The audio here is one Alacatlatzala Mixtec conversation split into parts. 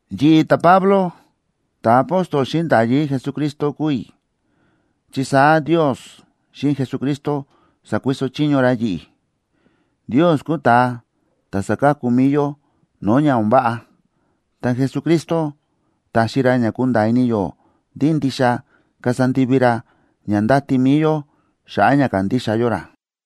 Yi̱ꞌi̱, ta̱Pablo, ta̱apóstol xíꞌin nda̱yí Jesucristo kúu i̱, chi saá Ndios xíꞌin Jesucristo sa̱kuiso chiño ra yi̱ꞌi̱. Ndios kúu ta̱a ta̱ sáka̱ku mi̱i yó no̱o̱ ña o̱n váꞌa, ta Jesucristo táxi ra ña kúnda̱a̱ ini yó ndí ndixa kasa ndivi ra ña ndáti mi̱i yó xa̱ꞌa̱ ña kándixa yó ra.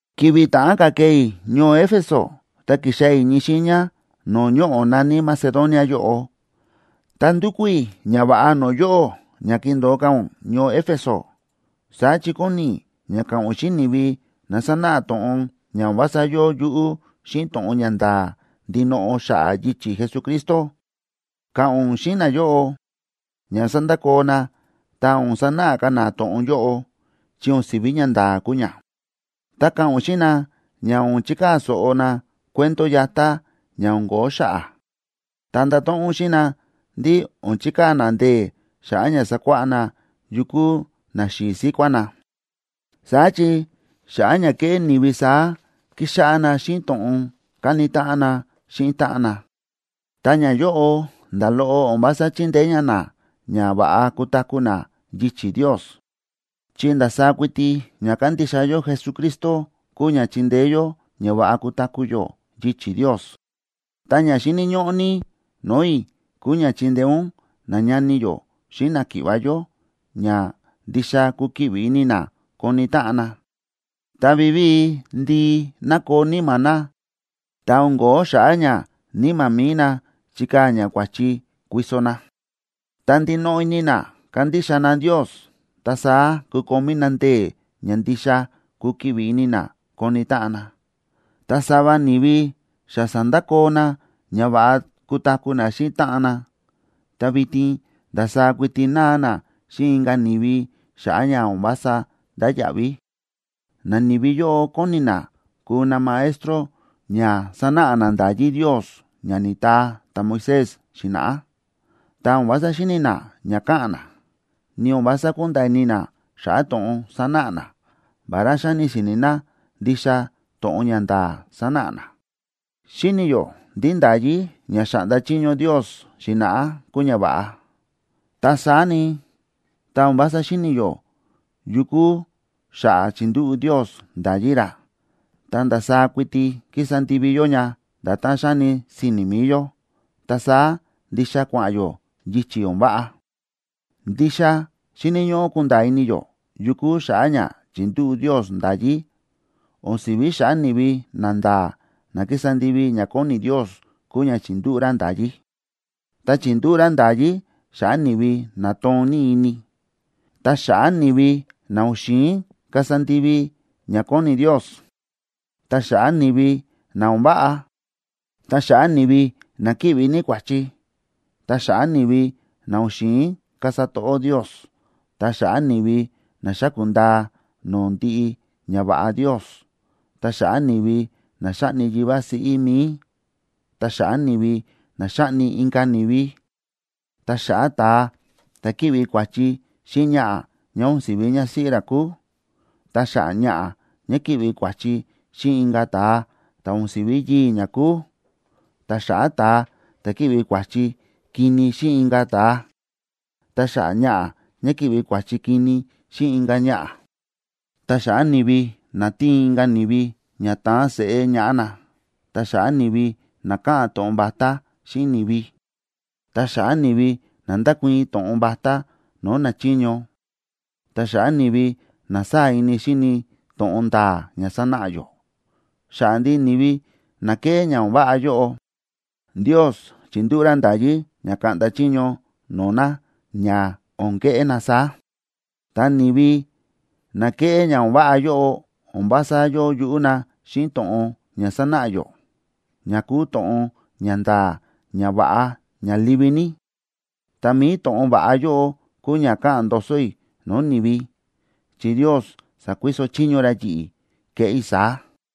Ki̱vi̱ ta̱ꞌán ka̱ kee i̱ ñoo Éfeso ta kixaa̱ i̱ ñii xiiña no̱o̱ ñoꞌo̱ na̱ní Macedonia yóꞌo, ta ndu̱kú i̱ ñava̱ꞌa no̱o̱ yóꞌó ña kindo̱o ka̱ ún ñoo Éfeso. Saá chi kóni i̱ ña ka̱ꞌa̱n ún xíꞌin ni̱vi na sánáꞌa to̱ꞌon ña o̱n vása yóo yuꞌú xíꞌin to̱ꞌon ña nda̱a̱ ndinoꞌo xa̱ꞌa̱ yichi̱ Jesucristo. Ka̱ꞌa̱n ún xíꞌin nayóꞌo ña sandakoo na, ta o̱n sanáꞌa ka̱ na to̱ꞌon yóꞌo, chi o̱n si̱ví ñanda̱a̱ kúu ña. Ta ka̱ꞌa̱n ún xíꞌin na ña o̱n chikaa̱ so̱ꞌo na cuento yatá ña o̱n ko̱ó xa̱ꞌa̱. Ta ndato̱ꞌon ún xíꞌin na ndí o̱n chikaa̱ na ndee̱ xa̱ꞌa̱ ña sakuáꞌá na yu kúu naxi̱i̱ síkuá na. Saá chi xa̱ꞌa̱ ña kéꞌé ni̱vi saá kíxáꞌá na xíꞌin to̱ꞌon káni táꞌan na xíꞌin táꞌan na, ta ñayóꞌo nda̱ loꞌo o̱n vása chíndeé ña na ña va̱ꞌa kutaku̱ na yichi̱ Ndios. Chi ndasaá kuiti ña kándixa yó Jesucristo kúu ña chíndeé yó ña va̱ꞌa kutaku̱ yó yichi̱ Ndios. Ta ña xíni̱ ñóꞌó ní no̱o̱ i̱ kúu ña chindeé ún nañani yó xíꞌin náki̱ꞌva̱ yó ña ndixa kukiꞌvi ini na koni táꞌan na. Tá vivíi ndii nakoo níma̱ na, ta o̱n ko̱ó xa̱ꞌa̱ ña níma̱ mi̱i na chikaa̱ ña kua̱chi kuiso na, ta ndinoꞌo ini na kandixa na Ndios, ta saá kukomí na ndee̱ ña ndixa kukiꞌvi ini na koni táꞌan na. Ta sava ni̱vi xa sa̱ndakoo na ña va̱ꞌa kutaku̱ na xíꞌin táꞌan na, ta vitin ndasaá kuiti náa na xíꞌin inka̱ ni̱vi xa̱ꞌa̱ ña o̱n vása ndáya̱ꞌví. Nani̱vi yóꞌo kóni na kuu na maestro ña sanáꞌa na nda̱yí Ndios ña ni̱taa ta̱Moisés xi̱na̱ꞌá, ta o̱n vása xíni̱ na ña káꞌa̱n na, ni o̱n vása kúnda̱a̱ ini na xa̱ꞌa̱ to̱ꞌon sánáꞌa na, vará xáni si̱ni̱ na ndixa to̱ꞌon ña nda̱a̱ sánáꞌa na. Xíni̱ yó ndí nda̱yí ña xa̱ꞌnda chiño Ndios xi̱na̱ꞌá kúu ña va̱ꞌa. Ta saá ni, tá o̱n vása xíni̱ yó yu kúu xa̱ꞌa̱ chi̱ndúꞌu̱ Ndios nda̱yí ra, ta ndasaá kuiti kísa ndivi yó ña nda̱tán xáni si̱ni̱ mi̱i yó, ta saá ndixa kua̱ꞌa̱n yó yichi̱ o̱n váꞌa. Ndixa xíni̱ ñóꞌó kunda̱a̱ ini yó yu kúu xa̱ꞌa̱ ña chi̱ndúꞌu̱ Ndios nda̱yí. O̱n si̱ví xa̱ꞌa̱ ni̱vi nanda̱a̱ na kísa ndivi ña kóni Ndios kúu ña chi̱ndúꞌu̱ ra nda̱yí. Ta chi̱ndúꞌu̱ ra nda̱yí xa̱ꞌa̱ ni̱vi na toon ní ini, ta xa̱ꞌa̱ ni̱vi na o̱n xi̱in kasa ndivi ña kóni Ndios, ta xa̱ꞌa̱ ni̱vi na o̱n váꞌa, ta xa̱ꞌa̱ ni̱vi na kíꞌvi ní kua̱chi, ta xa̱ꞌa̱ ni̱vi na o̱n xi̱in kasa to̱ꞌó Ndios, ta xa̱ꞌa̱ ni̱vi na xáku̱ ndaa no̱o̱ ndiꞌi ñava̱ꞌa Ndios, ta xa̱ꞌa̱ ni̱vi na xáꞌni yivá siꞌí mi̱i, ta xa̱ꞌa̱ ni̱vi na xáꞌni inka̱ ni̱vi, ta xa̱ꞌa̱ ta̱a ta̱ kíꞌvi kua̱chi xíꞌin ñaꞌa̱ ñá o̱n si̱ví ñásíꞌí ra kúu, ta xa̱ꞌa̱ ñaꞌa̱ ñá kíꞌvi kua̱chi xíꞌin inka̱ ta̱a ta̱ o̱n si̱ví yii̱ ñá kúu, ta xa̱ꞌa̱ ta̱a ta̱ kíꞌvi kua̱chi kini xíꞌin inka̱ ta̱a, ta xa̱ꞌa̱ ñaꞌa̱ ñá kíꞌvi kua̱chi kini xíꞌin inka̱ ñaꞌa̱, ta xa̱ꞌa̱ ni̱vi na tíin inka̱ ni̱vi ña taan seꞌé ñaꞌá na,a ta xa̱ꞌa̱ ni̱vi na káꞌa̱n to̱ꞌon vatá xíꞌin ni̱vi, ta xa̱ꞌa̱ ni̱vi na ndákuii̱n to̱ꞌon vatá no̱o̱ nachiño, ta xa̱ꞌa̱ ni̱vi na sáa̱ ini xíni to̱ꞌon nda̱a̱ ña sánáꞌa yó. Xa̱ꞌa̱ ndiꞌi ni̱vi na kéꞌé ña o̱n váꞌa yóꞌo, Ndios chi̱ndúꞌu̱ ra nda̱yí ña kaꞌnda chiño no̱o̱ na ña o̱n keꞌé na saá. Ta ni̱vi na kéꞌé ña o̱n váꞌa yóꞌo o̱n vása yóo yuꞌú na xíꞌin to̱ꞌon ña sánáꞌa yó, ña kúu to̱ꞌon ña nda̱a̱, ña va̱ꞌa, ña livi ní. Ta mi̱i to̱ꞌon va̱ꞌa yóꞌo kúu ña káꞌa̱n ndoso i̱ no̱o̱ ni̱vi, chi Ndios sa̱kuiso chiño ra yi̱ꞌi̱ keꞌé i̱ saá.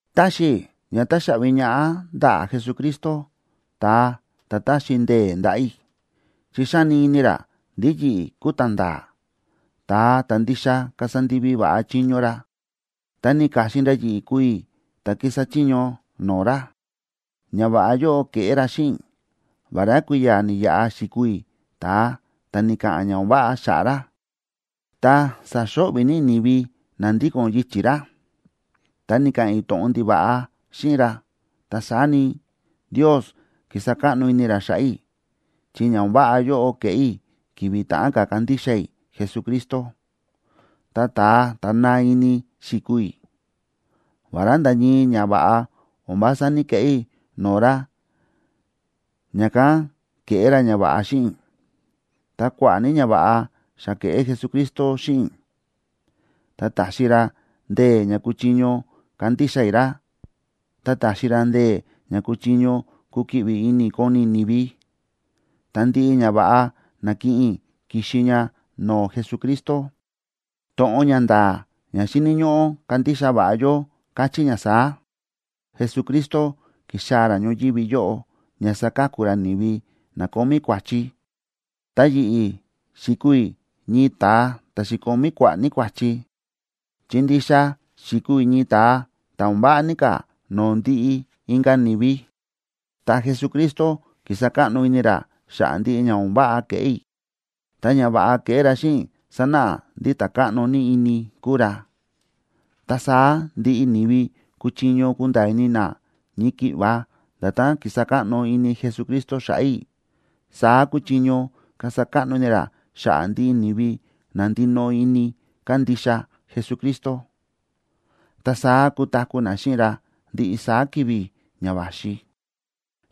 Táxi i̱ ña taxaꞌvi ñaꞌá ndaꞌa̱ Jesucristo, ta̱a ta̱ ta̱xi ndee̱ ndaꞌa̱ i̱, chi xáni ini ra ndí yi̱ꞌi̱ kúu ta̱nda̱a̱, ta̱a ta̱ ndixa kasa ndivi va̱ꞌa chiño ra, ta ni̱ka̱xin ra yi̱ꞌi̱ kuu i̱ ta̱ kísa chiño no̱o̱ ra. Ñava̱ꞌa yóꞌo ke̱ꞌé ra xíꞌin i̱, vará kui̱ya̱ ni̱yaꞌa xi̱kuu i̱ ta̱a ta̱ ni̱ka̱ꞌa̱n ña o̱n váꞌa xa̱ꞌa̱ ra, ta sa̱xo̱ꞌvi̱ ní i̱ ni̱vi na ndíko̱n yichi̱ ra, ta ni̱ka̱ꞌa̱n i̱ to̱ꞌon ndiva̱ꞌa xíꞌin ra. Ta saá ni, Ndios ki̱sa káꞌno ini ra xa̱ꞌa̱ i̱, chi ña o̱n váꞌa yóꞌo ke̱ꞌé i̱ ki̱vi̱ ta̱ꞌán ka̱ kandixa i̱ Jesucristo, ta ta̱a ta̱ naa ini xi̱kuu i̱. Vará nda̱ ñii ñava̱ꞌa o̱n vása ní‑keꞌé i̱ no̱o̱ ra ña̱kán ke̱ꞌé ra ñava̱ꞌa xíꞌin i̱, ta kua̱ꞌa̱ ní ñava̱ꞌa xa ke̱ꞌé Jesucristo xíꞌin i̱. Ta ta̱xi ra ndee̱ ña kuchiño kandixa i̱ ra, ta ta̱xi ra ndee̱ ña kuchiño kukiꞌvi ini i̱ koni i̱ ni̱vi. Ta ndiꞌi ñava̱ꞌa na̱kiꞌin i̱ ki̱xi ña no̱o̱ Jesucristo. To̱ꞌon ña nda̱a̱ ña xíni̱ ñóꞌó kandixa va̱ꞌa yó káchí ña saá: Jesucristo ki̱xaa̱ ra ñoyívi yóꞌo ña saka̱ku ra ni̱vi na kómí kua̱chi. Ta yi̱ꞌi̱, xi̱kuu i̱ ñii ta̱a ta̱ xi̱komí kua̱ꞌa̱ ní kua̱chi, chi ndixa xi̱kuu i̱ ñii ta̱a ta̱ o̱n váꞌa ní ka̱ no̱o̱ ndiꞌi inka̱ ni̱vi. Ta Jesucristo ki̱sa káꞌno ini ra xa̱ꞌa̱ ndiꞌi ña o̱n váꞌa ke̱ꞌé i̱. Ta ñava̱ꞌa ke̱ꞌé ra xíꞌin i̱ sánáꞌa ndí ta̱ káꞌno ní ini kúu ra. Ta saá ndiꞌi ni̱vi kúchiño kunda̱a̱ ini na ñii ki̱ꞌva nda̱tán ki̱sa káꞌno ini Jesucristo xa̱ꞌa̱ i̱, saá kúchiño kasa káꞌno ini ra xa̱ꞌa̱ ndiꞌi ni̱vi na ndinoꞌo ini kándixa Jesucristo, ta saá kutaku̱ na xíꞌin ra ndiꞌi saá ki̱vi̱ ña va̱xi.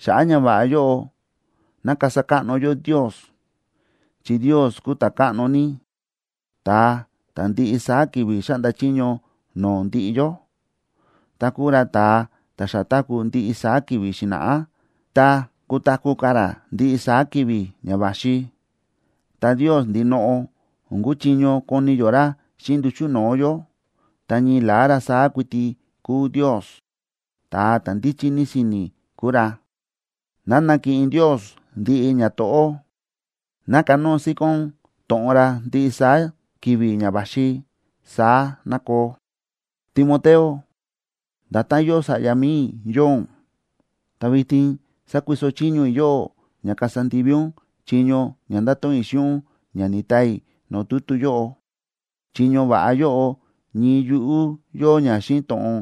Xa̱ꞌa̱ ñava̱ꞌa yóꞌo, ¡ná kasa káꞌno yó Ndios! ¡Chi Ndios kúu ta̱káꞌno ní, ta̱a ta̱ ndiꞌi saá ki̱vi̱ xáꞌnda chiño no̱o̱ ndiꞌi yó, ta kúu ra ta̱a ta̱ xa táku̱ ndiꞌi saá ki̱vi̱ xi̱na̱ꞌá, ta kutaku̱ ka̱ ra ndiꞌi saá ki̱vi̱ ña va̱xi! Ta Ndios ndinoꞌo, o̱n kúchiño koni yó ra xíꞌin nduchu̱ no̱o̱ yó, ta ñii la̱á ra saá kuiti kúu Ndios, ta̱a ta̱ ndíchí ní si̱ni̱ kúu ra. ¡Ná nakiꞌin Ndios ndiꞌi ñato̱ꞌó! ¡Ná kanóo síkón to̱ꞌon ra ndiꞌi saá ki̱vi̱ ña va̱xi! ¡Saá ná koo! Timoteo, nda̱tán yóo sa̱ꞌya mi̱i i̱ yóo ún, ta vitin sakuiso chiño i̱ yóꞌó ña kasa ndivi ún chiño ña nda̱to̱ꞌon i̱ xíꞌin ún ña ni̱taa i̱ no̱o̱ tutu yóꞌo. Chiño va̱ꞌa yóꞌo ñii yuꞌú yóo ña xíꞌin to̱ꞌon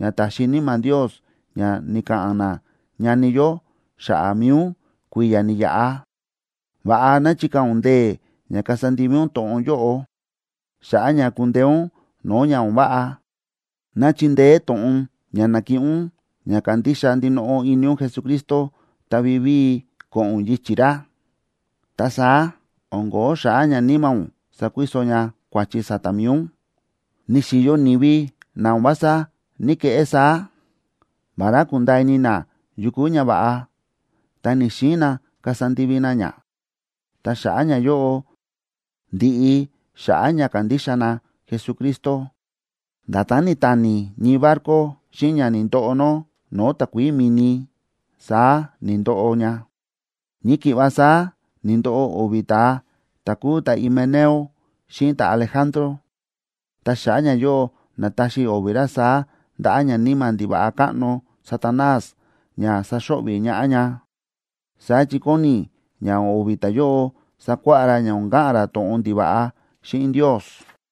ña ta̱xi Níma̱ Ndios ña ni̱ka̱ꞌa̱n nañani yó xa̱ꞌa̱ mi̱i ún kui̱ya̱ ni̱yaꞌa. Va̱ꞌa ná chikaa̱ ún ndee̱ ña kasa ndivi ún to̱ꞌon yóꞌo, xa̱ꞌa̱ ña kundeé ún no̱o̱ ña o̱n váꞌa. Ná chindeé to̱ꞌon ña na̱kiꞌin ún ña kandixa ndinoꞌo ini ún Jesucristo ta vivíi ko̱ꞌo̱n ún yichi̱ ra. Ta saá o̱n ko̱ó xa̱ꞌa̱ ña níma̱ ún sakuiso ña kua̱chi sa̱ta̱ mi̱i ún. Ni̱xi̱yo ni̱vi na o̱n vása ní‑keꞌé saá. Vará kúnda̱a̱ ini na yu kúu ñava̱ꞌa, ta ni̱‑xiin na kasa ndivi na ña. Ta xa̱ꞌa̱ ñayóꞌo, ndi̱ꞌi xa̱ꞌa̱ ña kándixa na Jesucristo. Nda̱tán ni̱tani ñii barco xíꞌin ña ni̱ndoꞌo nó no̱o̱ takuií mi̱ni, saá ni̱ndoꞌo ña. Ñii ki̱ꞌva saá ni̱ndoꞌo o̱vi̱ ta̱a ta̱ kúu ta̱Himeneo xíꞌin ta̱Alejandro, ta xa̱ꞌa̱ ñayóꞌo na̱taxi i̱ o̱vi̱ ra saá ndaꞌa̱ ñaníma̱ ndiva̱ꞌa káꞌno Satanás ña saxo̱ꞌvi̱ ñaꞌá ña. Saá chi kóni i̱ ña o̱vi̱ ta̱yóꞌo sakuáꞌá ra ña o̱n ka̱ꞌa̱n ra to̱ꞌon ndiva̱ꞌa xíꞌin Ndios.